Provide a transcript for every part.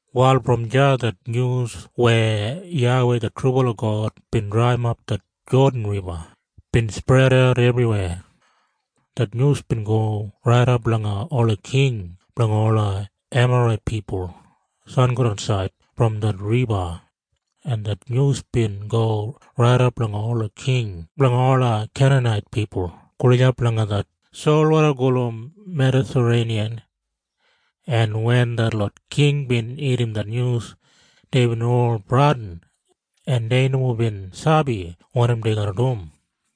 Wal brom deya det nyus weya YAWEI det trubala God bin draiyimap det Jodan Riba bin spredat ebriweya. Det nyus bin go raidap langa ola king blanga ola Emarait pipul sangodansaid brom det riba, en det nyus bin go raidap langa ola king blanga ola Keinanait pipul gulijap langa det solwoda gulum Medatareiniyan, en wen detlot king bin irrim det nyus, deibin ol bradin, en dei nomo bin sabi wanim dei garra dum.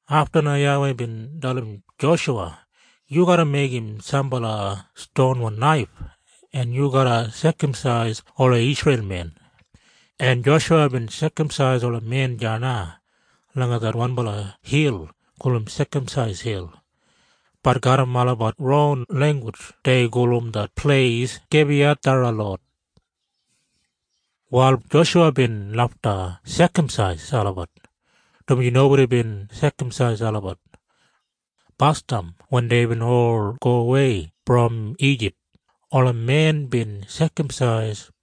Afta na YAWEI bin dalim Joshuwa, “Yu garra meigim sambala stonwan naif, en yu garra sekamsais ola Isreil men.” En Joshuwa bin sekamsais ola men deya na langa det wanbala hil gulum Sekamsais Hil. Bat garram olabat ronwan langgus dei gulum det pleis Gabiyatharaloth. Wal Joshuwa bin lafta sekamsais olabat dumaji nobodi bin sekamsais olabat. Basdam wen deibin ol gowei brom Ijip, ola men bin sekamsais.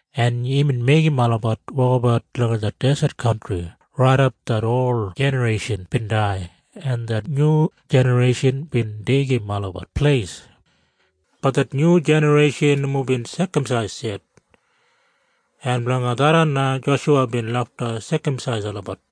En imbin meigim olabat wokabat langa det deset kantri raidap det ol jinareishan bin dai en det nyu jinareishan bin deigim olabat pleis. Bat det nyu jinareishan nomo bin sekamsais yet. En blanga tharran na Joshuwa bin lafta sekamsais olabat.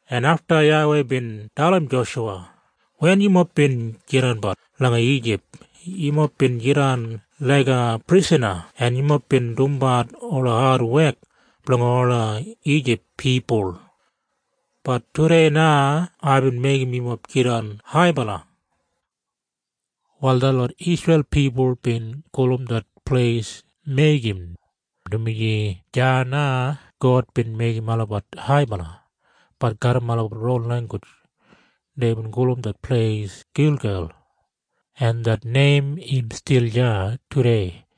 en afta YAWEI bin dalim Joshuwa, “Wen yumob bin jidanbat langa Ijip, yumob bin jidan laiga prisana en yumob bin dumbat ola adwek blanga ola Ijip pipul. Bat tudei na aibin meigim yumob jidan haibala.” Wal detlot Isreil pipul bin gulum det pleis Meigim, dumaji deya na God bin meigim olabat haibala. Bat garram olabat ron langgus deibin gulum det pleis Gilgel, en det neim im stil deya tudei.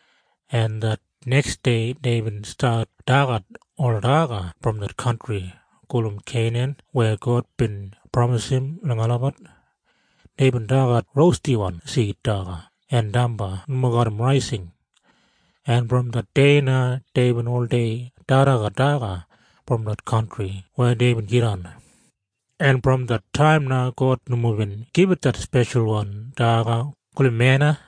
en det neksdei deibin stat dagat ola daga brom det kantri gulum Keinan weya God bin pramisim langa olabat. Deibin dagat rostidwan sid daga en damba nomo garram raising, en brom det dei na deibin oldei dagadagat daga brom det kantri weya deibin jidan. En brom det taim na God nomo bin gibit det speshalwan daga gulum mena.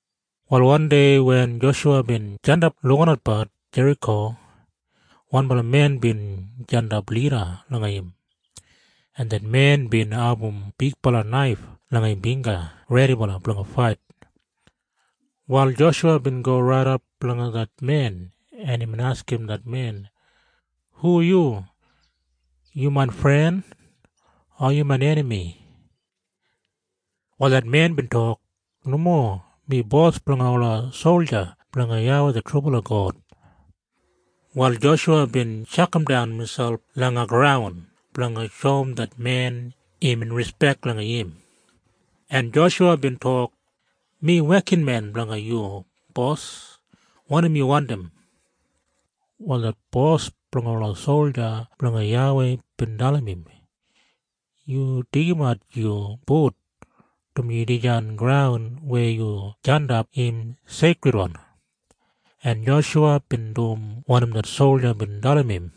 Wal wandei wen Joshuwa bin jandap lukinatbat Jeriko, wanbala men bin jandap lida langa im, en det men bin abum bigbala naif langa im bingga redibala blanga fait. Wal Joshuwa bin go raidap langa det men, en imbin askim det men, “Hu yu? Yu main fren? O yu main enami?” Wal det men bin tok, “Nomo. Mi bos blanga ola solja blanga YAWEI det trubala God.” Wal Joshuwa bin tjakamdan miselp langa graun blanga shoum det men imbin rispek langa im, en Joshuwa bin tok, “Mi wekinmen blanga yu, bos. Wanim yu wandim?” Wal det bos blanga ola solja blanga YAWEI bin dalim im, “Yu deigimat yu but, dumaji dijan graun weya yu jandap im seikridwan.” En Joshuwa bin dum wanim det solja bin dalim im.